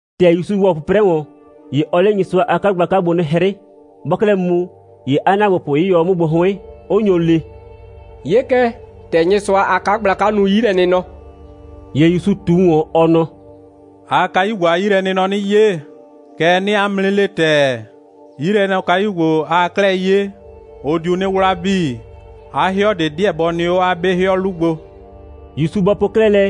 ‑Tɛ ‑Yusu ‑wɔ 'pʋprɛ ‑wɔn, ‑ye ɔɔ 'le Nyɩsʋa a 'kagblaka gbo 'nɩ 'hrɩ. Bɔɔ 'klɛɛ mu, ‑ye 'a ‑naagbopʋ 'yɩyɔ 'o 'mʋ gbo 'hʋɩn, 'ʋ nyo le: «'Ye kɛ, ‑tɛ Nyɩsʋa a 'kagblaka nu 'yilɛnɩnɔ.» ‑Ye ‑Yusu ꞊tu ‑wɔn, ɔ nɔ: «Aa kayu ‑gbo a 'yilɛnɩnɔ 'nɩ 'ye. Kɛɛ, 'nɩɩ 'a mʋ 'nɩ le ‑tɛɛ, 'yilɛnɔkayu ‑gbo, aa 'klɛɛ 'ye, ʋ diu 'nɩ 'wla 'bii. 'A 'hɩɔ ꞊de 'deɛ bɔ nɩ 'o 'a 'be 'hɩɔ 'lu gbo.» ‑Yusu bɔ po 'klɛɛ lɛ,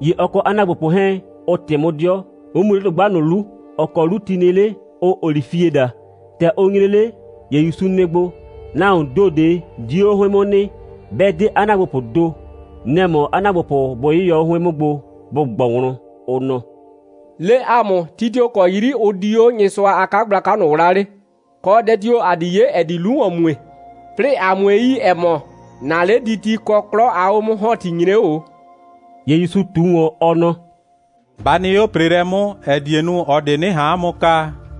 ‑ye ɔ kɔ 'a ‑naagbopʋ 'hɛɛn, ʋ ꞊tɩ 'mʋ 'dɩɔ, 'ʋ mu 'le dʋgba ꞊nʋ 'lu, ‑ɔ kɔ 'lu ti nɩ 'le, ʋʋ olifie daa. ‑Tɛ ʋ nyre 'le, ‑ye ‑Yusu nɩ gbo, nahuoon ‑do ꞊de 'dio 'o 'hʋɩn 'mʋ nɩ, 'bɛ 'de 'a ‑naagbopʋʋ ‑do. Nɛ‑ mɔ 'a ‑naagbopʋ bʋ 'yɩyɔ 'o 'hʋɩn 'mʋ gbo, bʋ ꞊gbɔ wlɔn, ʋ nɔ: «Le ‑a mʋ, ti tio‑ kɔ 'yri ʋ di 'o Nyɩsʋa a 'kagblaka ꞊nʋ 'wlaa 'le, kɔ dɛ tio‑ ‑a di 'ye, ‑ɛ di 'lu ‑wɔn mue, 'plɩɩ ‑a 'mue yi, ‑ɛ mɔ, ‑na 'lediti kɔ 'klɔ a 'o'mʋ‑hɔnti nyre 'o ꞊o.» ‑Ye ‑Yusu ꞊tu ‑wɔn, ɔ nɔ: «Ba nɩ 'o ‑preelɛ 'mʋ, ‑ɛ die nu, ꞊ɔ ꞊de 'nɩ ꞊han 'a mʋ kaa,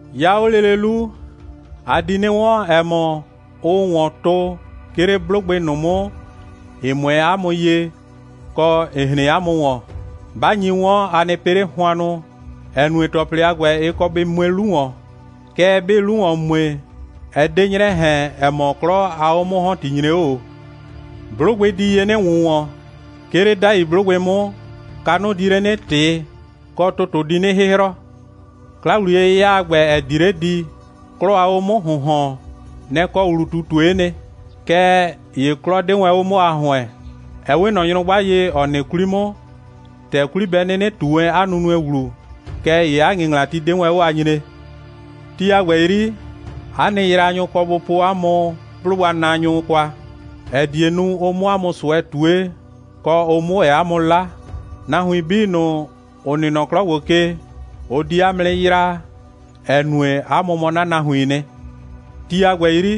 'Ya 'o lele 'lu, a di 'nɩ 'wɔn, ‑ɛ mɔ, ʋʋ ‑wɔn tʋ, 'ke 'le 'blʋgbɩ ꞊nʋ 'mʋ, ‑ɩ 'mʋɛɛ 'a mʋ ye, kɔ, ‑ɩ hren 'a mʋ ‑wɔn. 'Ba nyi 'wɔn, a nɩ pɩ 'le hʋannʋ, ‑ɛ nue, ‑tɔplɩ a ‑gbɛ, ɩ kɔ bɩ mue 'lu ‑wɔn. Kɛɛ, 'bɩɩ 'lu ‑wɔn mue, ɛ 'de 'nyrɛ ꞊hɛn, ‑ɛ mɔ, 'klɔ a 'o'mʋ‑hɔnti nyre 'o ꞊o. 'Blʋgbɩ di ye 'nɩ ‑wʋnwɔn. 'Ke 'le 'dai 'blʋgbɩ 'mʋ, kanʋ di 'nɩ ꞊tɩ, kɔ, ‑tʋtʋ di 'nɩ 'hɩhrɔ. 'Kla‑wliye'yɩya a ‑gbɛ, ‑ɛ di 'le di, 'klɔ a 'o'mʋ‑hʋnhɔn, nɛ‑ kɔ ‑wlu꞊tutue'e nɩ. Kɛɛ ‑ye 'klɔ 'de wɛn 'o 'mʋ a ‑hʋɛn. Ɛ 'we ꞊nɔ nyrʋgba ye, ‑ɔ nɩ 'kwli 'mʋ, ‑tɛ 'kwli bɛ 'nɩnɩ ꞊tu wɛn 'a nunue ‑wlu, kɛɛ ‑ye 'a ‑ŋɩŋlati 'de wɛn 'o a nyree. Ti a ‑gbɛ 'yri, 'a nɩ yraanyʋ kɔ bʋ po 'a mʋ 'blʋgbanaanyʋ kwa, ‑ɛ die nu, ʋ 'mʋ 'a mʋ ꞊sʋɛ ꞊tue, kɔ, ʋ 'mʋ ‑wɛ 'a mʋ 'la. Nahuin 'bii ꞊nʋ, ‑ʋ nɩ nɔ 'klɔ ‑gbo ke, ʋ di 'a mʋ 'nɩ yraa, ‑ɛ nue, 'a mʋ mɔ 'na nahuiin nɩ. Ti a ‑gbɛ 'yri,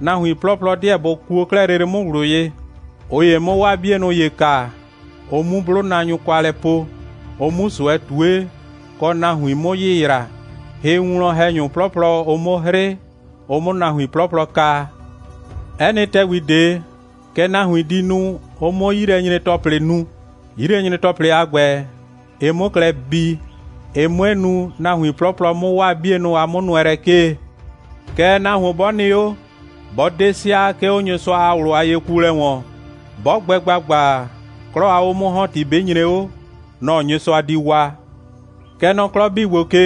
nahuin 'plɔplɔ 'deɛ bʋ kuo 'klɛɛ lele 'mʋ ꞊wlʋ ye, ꞊ʋ ‑ye 'mʋ 'waa 'bienʋ ‑ye kaa, ʋ 'mu 'blʋnaanyʋ kwa lɛ po, ʋ 'mu ꞊sʋɛ ꞊tue, kɔ, nahuin 'mʋ yɩyraa, hɩwinwlɔn‑hɛnyʋ 'plɔplɔ 'mʋ 'hrɩ, ʋ 'mʋ nahuin 'plɔplɔ kaa. 'Ɛ nɩ ‑tɛgbi ꞊de, kɛ nahuin di nu, ʋ 'mʋ 'yilɛnyre‑tɔplɩ nu, 'yilɛnyre‑tɔplɩ a ‑gbɛ, ɩ 'mʋ klɛ bii, ɩ 'mue nu, nahuin 'plɔplɔ 'mʋ 'waa 'bienʋ a 'mʋnʋɛlɛ 'kee. Kɛɛ, nahuon 'bɔ nɩ 'o, 'bɔ 'de sɩa, 'ke 'o Nyɩsʋa a ꞊wlʋ a yekuolɛ ‑wɔn, 'bɔ gbɛ ‑gbagba, 'klɔ a 'o'mʋ‑hɔnti 'bɩ nyre 'o, nɔ‑ Nyɩsʋa di waa. Kɛ nɔ 'klɔ 'bii ‑gbo ke,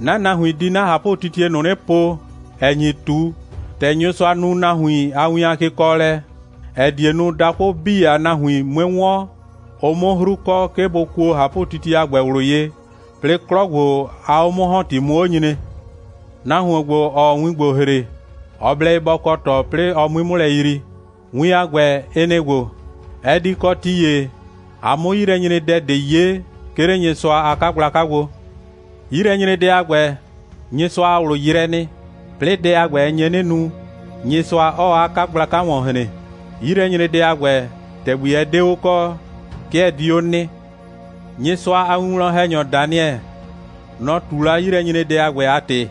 'na nahuin di 'na ꞊hapʋtitie ꞊nʋ 'nɩ po, ‑ɛ nyi ꞊tu, ‑tɛ Nyɩsʋa nu nahuin a win a kekɔɔlɛ, ‑ɛ die nu, dakʋ 'bii a nahuin 'mue 'wɔn, ʋ 'mʋ 'hru kɔ, 'ke bʋ kuo ꞊hapʋtitie a ‑gbɛ ꞊wlʋ ye, 'plɩɩ 'klɔ ‑gbo a 'o'mʋ‑hɔnti 'mʋ 'o nyre.» «Nahuon ‑gbo, ‑ɔɔ win ‑gbo ‑hre, ɔ blɛ ye bɔ kɔ ꞊tɔ, 'plɩɩ ɔ 'mui 'mʋ lɛ yrii. Win a ‑gbɛ, ɩ nɩ‑ ‑gbo: Ɛ di kɔ ti ‑ye, a 'mʋ 'yilɛnyredɛ ꞊de 'ye, 'ke 'le Nyɩsʋa a 'kagblaka gbo. 'Yilɛnyredɛ a ‑gbɛ, Nyɩsʋa a ꞊wlʋ yrɛɛ nɩ, 'plɩɩ dɛ a ‑gbɛ, ɛ nye 'nɩ nu, Nyɩsʋa 'ɔɔ 'a 'kagblaka ‑wɔn hren. 'Yilɛnyredɛ a ‑gbɛ, ‑tɛgbi ɛ 'de 'o kɔ, 'ke ɛ di 'o nɩ. Nyɩsʋa a winwlɔn‑hɛnyɔ Daniɛ, nɔ‑ ꞊tu la 'yilɛnyredɛ a ‑gbɛ a ‑tɩ.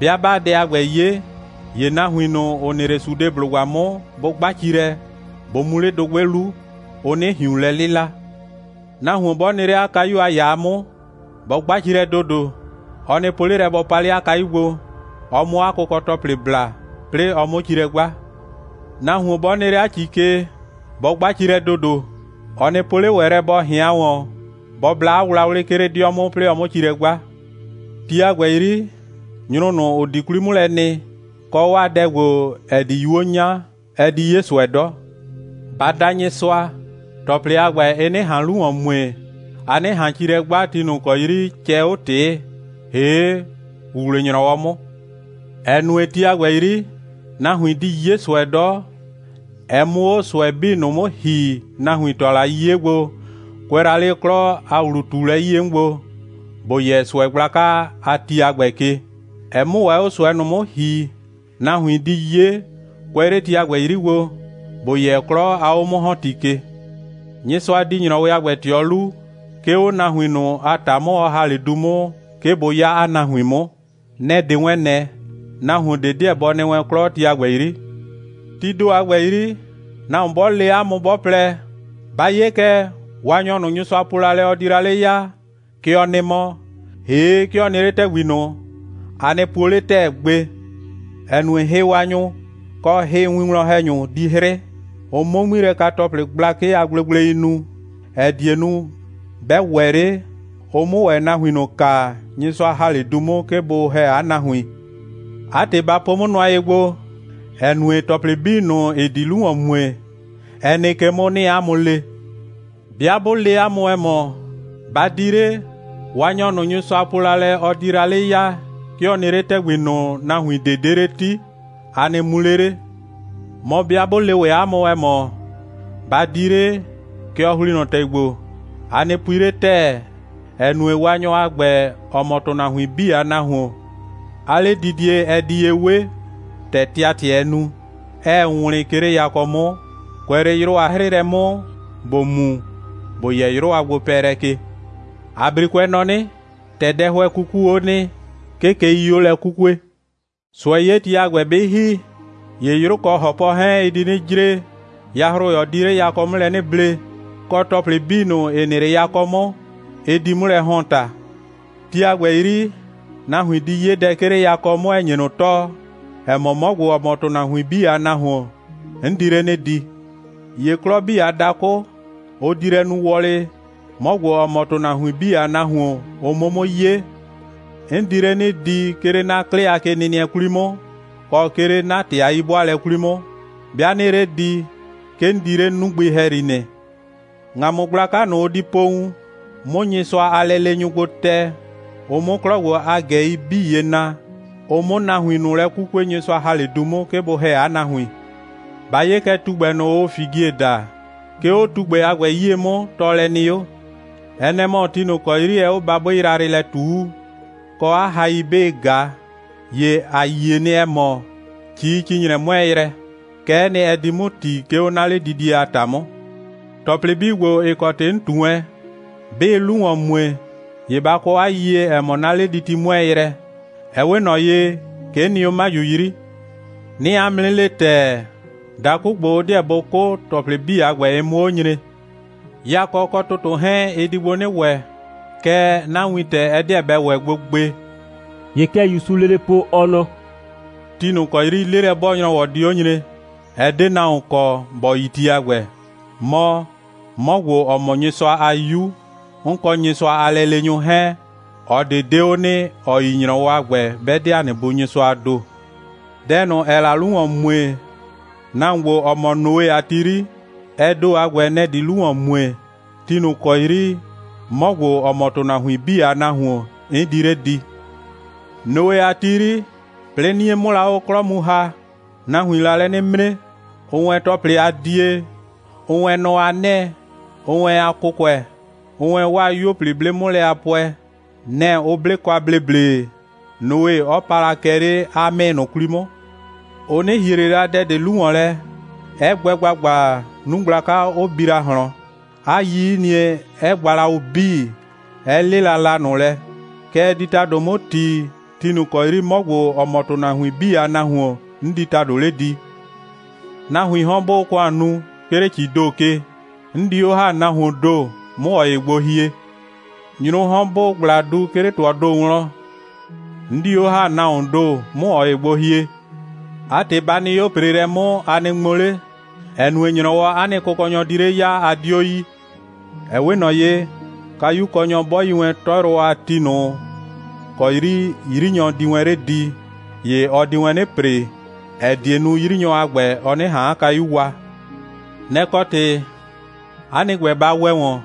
'Bɩa 'baa dɛ a ‑gbɛ 'ye, ‑ye nahuin ꞊nʋ, ‑ʋ nɩ 'le Sudeblʋgba 'mʋ, bʋ 'gba ci lɛ, bʋ mu 'le dʋgbɩ 'lu, ʋ 'nɩ ꞊hiun lɛ 'lɩla. Nahuon 'bɔ nɩ 'le 'a kayu a ‑yaa 'mʋ, bɔ 'gba ci lɛ ‑dodo. Ɔ nɩ po 'le lɛ, bɔ pa 'le 'a kayu gbo, ɔ 'mʋ 'a kʋkɔ‑tɔplɩ bla, 'plɩɩ ɔ 'mʋ ci lɛ 'gba. Nahuon 'bɔ nɩ 'le 'a ‑ci ke, bɔ 'gba ci lɛ ‑dodo. Ɔ nɩ po 'le ‑wɛ lɛ, bɔ ꞊hɩan ‑wɔn, bɔ bla 'a wlawlɩ, 'ke 'le 'dɩɔ 'mʋ, 'plɩɩ ɔ 'mʋ ci lɛ 'gba. Ti a ‑gbɛ 'yri, nyrʋ ꞊nʋ, ‑ʋ di 'kwlii 'mʋ lɛ nɩ, kɔ, 'waa dɛ ‑gbo, ‑ɛ di 'yuo 'nya, ɛ di 'ye ꞊sʋɛ 'dɔ. Ba da Nyɩsʋa, ‑tɔplɩ a ‑gbɛ, ɩ 'nɩ ꞊han 'lu ‑wɔn mue, a 'nɩ ꞊han ci lɛ 'gba, ti ꞊nʋ ‑kɔ 'yri cɛɛ 'o ꞊tɩɩ, ‑hee' ‑wuwle‑nyrɔwɔ 'mʋ, ‑ɛ nue, ti a ‑gbɛ 'yri, nahuin di 'ye ꞊sʋɛ 'dɔ, ɛ 'mʋ 'o ꞊sʋɛ 'bii ꞊nʋ 'mʋ ‑hi, nahuin ‑tʋa la 'le 'yiye gbo, kʋɛ la 'le 'klɔ a ‑wlu꞊tuulɛ 'yie 'mʋ gbo, ‑bo yɛ ꞊sʋɛ gblaka a ti a ‑gbɛ ke, ɛ 'mʋ ‑wɛ 'o ꞊sʋɛ ꞊nʋ 'mʋ ‑hi, nahuin di 'ye, kʋɛ 'le ti a ‑gbɛ 'yri gbo, ‑bo yɛ 'klɔ a 'o'mʋ‑hɔnti ke. Nyɩsʋa di ‑nyrɔwɩ a gbɛ ꞊tɩɔ 'lu, 'ke 'o nahuin ꞊nʋ a ‑ta 'mʋ, ɔ ‑ha 'le du 'mʋ, 'ke bʋ 'ya 'a nahuin 'mʋ. Nɛ‑ 'de wɛn ꞊nɛ, nahuon ꞊de 'deɛ bɔ nɩ wɛn 'klɔ, ti a ‑gbɛ 'yri. Tii ‑do a ‑gbɛ 'yri, nahuon 'bɔ le 'a mʋ, 'bɔ plɛ: Ba 'ye kɛ, Waanyɔ ꞊nʋ, Nyɩsʋa po la lɛ, ɔ di la 'le ya, kɛ ɔ nɩ mɔ, ‑hee' 'ke ɔ nɩ 'le ‑tɛgbi ꞊nʋ, a nɩ puo 'le ‑tɛɛ gbe, ‑ɛ nue, hɩwaanyʋ, kɔ hɩwinwlɔn‑hɛnyʋ di 'hrɩ, ʋ 'mʋ 'ŋmilɛka‑tɔplɩ gblakɩ a gblegblei nu, ‑ɛ die nu, 'bɛ ‑wɛ 'le, ʋ 'mʋ ‑wɛ nahuin ꞊nʋ kaa, Nyɩsʋa ‑ha 'le du 'mʋ, 'ke bʋ ‑hɛ 'a nahuin. 'A ‑tɩ, ba po 'mʋ nʋa ye gbo, ‑ɛ nue, ‑tɔplɩ 'bii ꞊nʋ, ‑ɩ di 'lu ‑wɔn mue, ɛ nɩ ke 'mʋ, 'nɩɩ 'a mʋ le. 'Bɩa 'bʋ le 'a mʋ, ‑ɛ mɔ: Ba di 'le, Waanyɔ ꞊nʋ, Nyɩsʋa po la lɛ, ɔ di la 'le ya, 'ke ɔ nɩ 'le ‑tɛgbi ꞊nʋ, nahuin ꞊de 'de 'le 'ti! a nɩ mu 'le 'le. Mɔ, 'bɩa 'bʋ le ‑wɛ 'a mʋ, ‑ɛ mɔ: Ba di 'le, kɛ ɔ ‑hli nɔ ‑tɛgbi ‑gbo! a nɩ pui 'le ‑tɛɛ, ‑ɛ nue, Waanyɔ a ‑gbɛ, ‑ɔ mɔ ‑tʋnahuin 'bii a Nahuon, 'a 'ledidie, ɛ di ye 'we ‑tɛ tɩatɩɛɛ nu, 'ɛɛ wlɩn, 'ke 'le yakɔ 'mʋ, kʋɛ 'le 'yrʋ a 'hrɩɩlɛ 'mʋ, ‑bo mu, ‑bo yɛ 'yrʋ a gbopɛɛlɛ ke. ‑A 'brikʋɛ nɔ 'nɩ: ‑Tɛ dɛhʋɛ 'kukuu 'o nɩ, 'ke keii 'o lɛ 'kukue.» «꞊Sʋɛ'yeti a ‑gbɛ 'bɩ ‑hi, ‑ye 'yrʋ kɔ ‑hɔpɔ 'hɛɛn, ɩ di 'nɩ jre, yahroyɔ di 'le yakɔ 'mʋ lɛ 'nɩ ble, kɔ ‑tɔplɩ 'bii, ‑ɩ nɩ 'le yakɔ 'mʋ, ɩ di 'mʋ lɛ ‑hɔn ‑ta. Tii ‑do a ‑gbɛ 'yri, nahuin di 'ye dɛ, 'ke 'le yakɔ 'mʋ, ‑ɛ nye ꞊nʋ tɔɔ, ‑ɛ mɔ, 'mɔ ‑gbo, ‑ɔ mɔ ‑tʋnahuin 'bii a Nahuon, 'n di 'le 'nɩ di. ‑Ye 'klɔ 'bii a dakʋ, ʋ di lɛ nu wɔlɩ, 'mɔ ‑gbo, ‑ɔ mɔ ‑tʋnahuin 'bii a Nahuon, ʋ 'mʋ 'mʋ 'ye. 'N di 'le 'nɩ di, 'ke 'le 'na 'klɩ a kenɩnɩɛ 'kwli 'mʋ, kɔ, 'ke 'le 'na ‑tɩ a 'yi'bʋaalɛ 'kwli 'mʋ. 'Bɩa 'nɩɩ 'le di, 'ke 'n di 'le 'nugbɩ ‑hɛyri nɩ. ‑Ŋamʋ gblaka ꞊nʋ, ʋ di po wun, 'mʋ Nyɩsʋa a lɛleenyʋ gbo tɛ, ʋ 'mʋ 'klɔ ‑gbo a ꞊gɛi 'bii ye na, ʋ 'mʋ nahuin ꞊nʋ lɛ 'kukue, Nyɩsʋa ‑ha 'le du 'mʋ, 'ke bʋ ‑hɛ 'a nahuin.» «Ba 'ye kɛ tugbɛ ꞊nʋ, ʋʋ figie daa. 'Ke 'o tugbɛ a ‑gbɛ 'yie 'mʋ, tɔɔlɛ nɩ 'o. Ɛ nɛ‑ mɔ, ti ꞊nʋ ‑kɔ 'yri ɛɛ 'o babʋɩ yrayrɩ lɛ ꞊tuu, kɔ 'a hai 'bɩɩ ꞊ga, ‑ye ‑a yie nɩ, ‑ɛ mɔ, ‑cii‑ci‑nyrɛ 'mʋɛɛ yrɛ. Kɛ'ɛ nɩ, ɛ di 'mʋ ‑ti, 'ke 'o 'na 'ledidie a ‑ta 'mʋ. ‑Tɔplɩ 'bii ‑gbo, ‑ɩ kɔ ‑tɩ 'n ꞊tu wɛn, 'bɩɩ 'lu ‑wɔn mue, ‑ye ba kɔ 'a yiyie, ‑ɛ mɔ, 'na 'lediti 'mʋɛɛ yrɛ. Ɛ 'we ꞊nɔ ye, 'ke 'n nɩ 'o 'maju 'yri. 'Nɩɩ 'a mʋ 'nɩ le ‑tɛɛ, dakʋ ‑gbo, ʋ 'deɛ bʋ 'kʋ, ‑tɔplɩ 'bii a ‑gbɛ, ɩ 'mʋ 'o nyre. Yakɔ kɔ ‑tʋtʋ 'hɛɛn, ɩ di gbo 'nɩ ‑wɛ, kɛɛ, 'na wintɛ, ɛ 'deɛ bɛ ‑wɛ gbo gbe.» ‑Ye kɛ ‑Yusuu lele po, ɔ nɔ: «Ti ꞊nʋ ‑kɔ 'yri 'lelɛ'bɔɔ‑nyrɔwɔ di 'o nyre, ɛ 'de nahuon kɔ, ‑bɔ yi ti a ‑gbɛ. Mɔ, 'mɔ ‑gbo, ‑ɔ mɔ Nyɩsʋa a 'Yu, 'n kɔ Nyɩsʋa a lɛleenyʋ 'hɛɛn, ꞊ɔ ꞊de 'de 'o nɩ, ‑ɔ yi ‑nyrɔwɔ a ‑gbɛ, 'bɛ 'de ‑a nɩ Bu Nyɩsʋaa ‑do. Dɛ ꞊nʋ, ‑ɛɛ la 'lu ‑wɔn mue, nahuon ‑gbo, ‑ɔ mɔ Noe a ti 'yri, ɛ ‑do a ‑gbɛ, nɛ‑ di 'lu ‑wɔn mue, ti ꞊nʋ ‑kɔ 'yri 'mɔ ‑gbo, ‑ɔ mɔ ‑tʋnahuin 'bii a Nahuon, 'n di 'le di. Noe a ti 'yri, 'plɩɩ 'nie 'mʋ la 'o 'klɔ mu ‑ha, nahuiin la lɛ 'nɩ 'mre, ʋʋ wɛn ‑tɔplɩ a die, ʋʋ wɛn nɔ a 'nɛɛ, ʋʋ wɛn a kʋkʋɛ, ʋʋ wɛn 'waa 'yuo 'blɩ 'mʋ lɛ a pʋɛ. Nɛ‑ ʋ 'ble kwa ‑bleble, Noe 'ɔ pa la kɛ 'le 'a 'mɩɩ ꞊nʋ 'kwli 'mʋ. Ʋ 'nɩ ‑hie ꞊le la dɛ ꞊de 'lu ‑wɔn lɛ, 'ɛ gbɛ ‑gbagba, 'nu gblaka 'ʋ bi la ꞊hlɔn, 'a 'yiyinie 'ɛ gba la ʋ 'bii, 'ɛ 'lɩla la ꞊nʋ lɛ. Kɛ ɛ di ‑tado 'mʋ ‑ti, ti ꞊nʋ ‑kɔ 'yri 'mɔ ‑gbo, ‑ɔ mɔ ‑tʋnahuin 'bii a Nahuon, 'n di ‑tado 'le di. Nahuiin 'hɔn, 'bʋʋ ‑kʋan nu, 'ke 'le ‑cii ‑do ke, 'n di 'o ‑ha nahuoon ‑do, 'mʋ ꞊ɔ ‑ye gbo hie. Nyrʋʋ 'hɔn, 'bʋʋ ꞊gbla du, 'ke 'le ‑tʋɔɔ ‑do wlɔn, 'n di 'o ‑ha nahuoon ‑do, 'mʋ ꞊ɔ ‑ye gbo hie. 'A ‑tɩ, ba nɩ 'o ‑preelɛ 'mʋ, a nɩ ŋmo 'le, ‑ɛ nue, ‑nyrɔwɔ, 'a nɩ Kʋkɔnyɔ di 'le ya, a 'dio yi. Ɛ 'we ꞊nɔ ye, kayukɔnyɔ 'bɔ yi wɛn 'tɔyrʋwɔ a ti ꞊nʋ ‑kɔ 'yri 'yrinyɔ di wɛn 'le di, ‑ye ɔ di wɛn 'nɩ ‑pre, ‑ɛ die nu, 'yrinyɔ a ‑gbɛ, ɔ 'nɩ ꞊han 'a kayu wa. Nɛ‑ kɔ ‑tɩ, 'a nɩ ‑gbɛ, ba ‑wɛ ‑wɔn,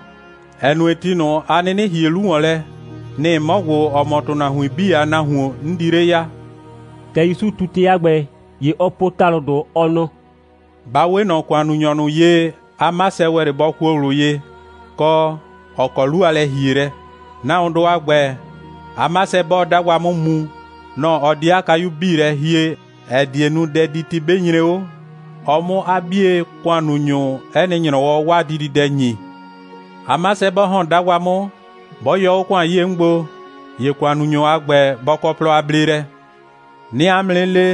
‑ɛ nue, ti ꞊nʋ, a 'nɩnɩ ‑hie 'lu ‑wɔn lɛ, nɩ‑ 'mɔ ‑gbo, ‑ɔ mɔ ‑tʋnahuin 'bii a Nahuon, 'n di 'le ya.» ‑Tɛ ‑Yusu ꞊tu ‑tɩ a ‑gbɛ, ‑ye ɔ po ‑talʋdʋ, ɔ nɔ: «Ba 'we ꞊nɔ ‑kʋannunyɔ ꞊nʋ ye, 'a 'masɛ ‑wɛ 'le bɔ kuo ꞊wlʋ ye, kɔ, ‑ɔ kɔ 'lu a lɛ‑hielɛ. Nahuondʋ a ‑gbɛ, 'a 'masɛ, 'bɔɔ 'dagba 'mʋ mu, nɔ‑ ɔ di 'a kayu 'bii lɛ hie, ‑ɛ die nu, dɛditi 'bɩ nyre 'o, ɔ 'mʋ 'a 'bie ‑kʋannunyʋ 'ɛ nɩ ‑nyrɔwɔ 'waa dididɛ ‑nyi. 'A 'masɛ 'bɔ ‑hɔn 'dagba 'mʋ, 'bɔ yɔ 'o ‑kʋan 'yie 'mʋ gbo, ‑ye ‑kʋannunyɔ a ‑gbɛ, bɔ kɔ plɔ a bleelɛ. 'Nɩɩ 'a mʋ 'nɩ le,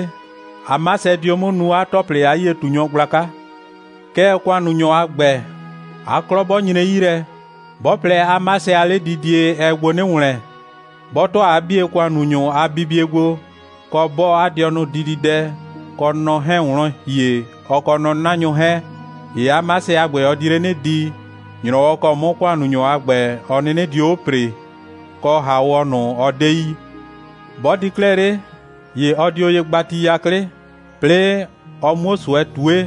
'a 'masɛ dio 'mʋ nuu 'a ‑tɔplɩ a 'yie꞊tunyɔ gblaka. Kɛɛ, ‑kʋannunyɔ a ‑gbɛ, 'a 'klɔ 'bɔ nyre 'yi lɛ, 'bɔ plɛ, 'a 'masɛ a 'ledidie, ɛɛ gbo 'nɩ ‑wlɛn, 'bɔ ‑tʋa 'a 'bie ‑kʋannunyʋ a bibie gbo, kɔ, 'bɔɔ 'a dɩɔnʋ dididɛ kɔ nɔ 'hɛɛn wlɔn ‑hie, ɔ kɔ nɔ'nanyʋ 'hɛɛn, ‑ye 'a 'masɛ a ‑gbɛ, ɔ di 'le 'nɩ di, ‑nyrɔwɔ ‑kɔ 'mʋ ‑kʋannunyɔ a ‑gbɛ, ɔ 'nɩnɩ dio 'o ‑pree, kɔ ‑haawɔ ꞊nʋ, ɔ 'de yi. 'Bɔ di 'klɛɛ 'le, ‑ye ɔ dio ye gba ti 'yaklɩ, 'plɩɩ ɔ 'muo ꞊sʋɛ ꞊tue,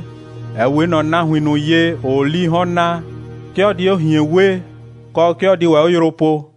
‑ɛ 'we ꞊nɔ nahuin ꞊nʋ ye, ‑ʋʋ 'lii 'hɔn naa. 'Ke ɔ di 'o ꞊hien wee, kɔ, 'ke ɔ di ‑wɛ 'o yrʋ poo.»